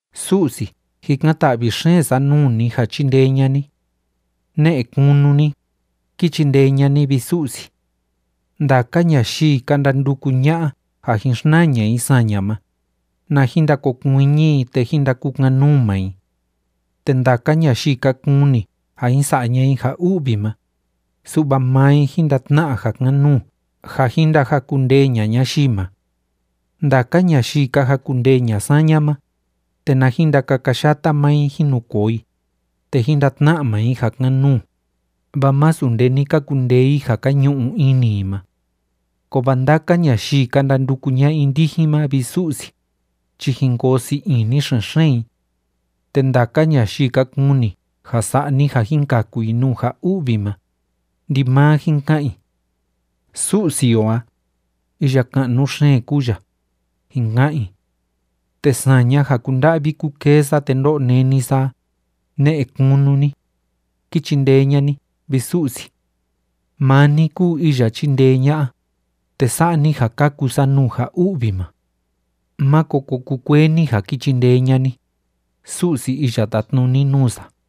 Su'si, jikan‑ta'vi xeen sa nuu ni ja chindee ña'a ni. Ne'e kunu ni, ki chindee ña'a ni, vi Su'si. Ndaka ñayii ka ndanduku ña'a ja jin xnaa ña'a i saña ma, na jin ndakokuiñi i te jín ndakukan‑nuu maa i. Te ndaka ñayii ka kuni ja jin sa'a ña'a i ja u'vi ma, su'va maa i jín ndatna'a ja kan‑nuu ja jin ndajakundee ña'a ñayii ma. Ndaka ñayii ka jakundendee ña'a saña ma, te na jin ndakakayata maa i jín nu koo i, te jín ndatna'a maa i ja kan‑nuu, vaa masu nde ni ka kundee i ja ka ñu'u ini i ma. Kovaa ndaka ñayii ka ndanduku ña'a i ndijin ma, vi Su'si, chi jin koo sii ini xen‑xeen i. Te ndaka ñayii ka kuni ja sa'a ni ja jin kaku i nuu ja u'vi ma, ndimaa jin ka'an i: “Su'si o a, iya ka'nu xeen kúu ya”, jin ka'an i. Te saña ja kúnda'vi kúkee sa te ndó'o néni sa a, ne'e kunu ni, ki chindee ña'a ni, vi Su'si. Maa ni kúu iya chindee ña'a, te sa'a ni ja kaku sa nuu ja u'vi ma. Máko ko kukuee ni ja ki chindee ña'a ni, Su'si iya tátnuni nuu sa.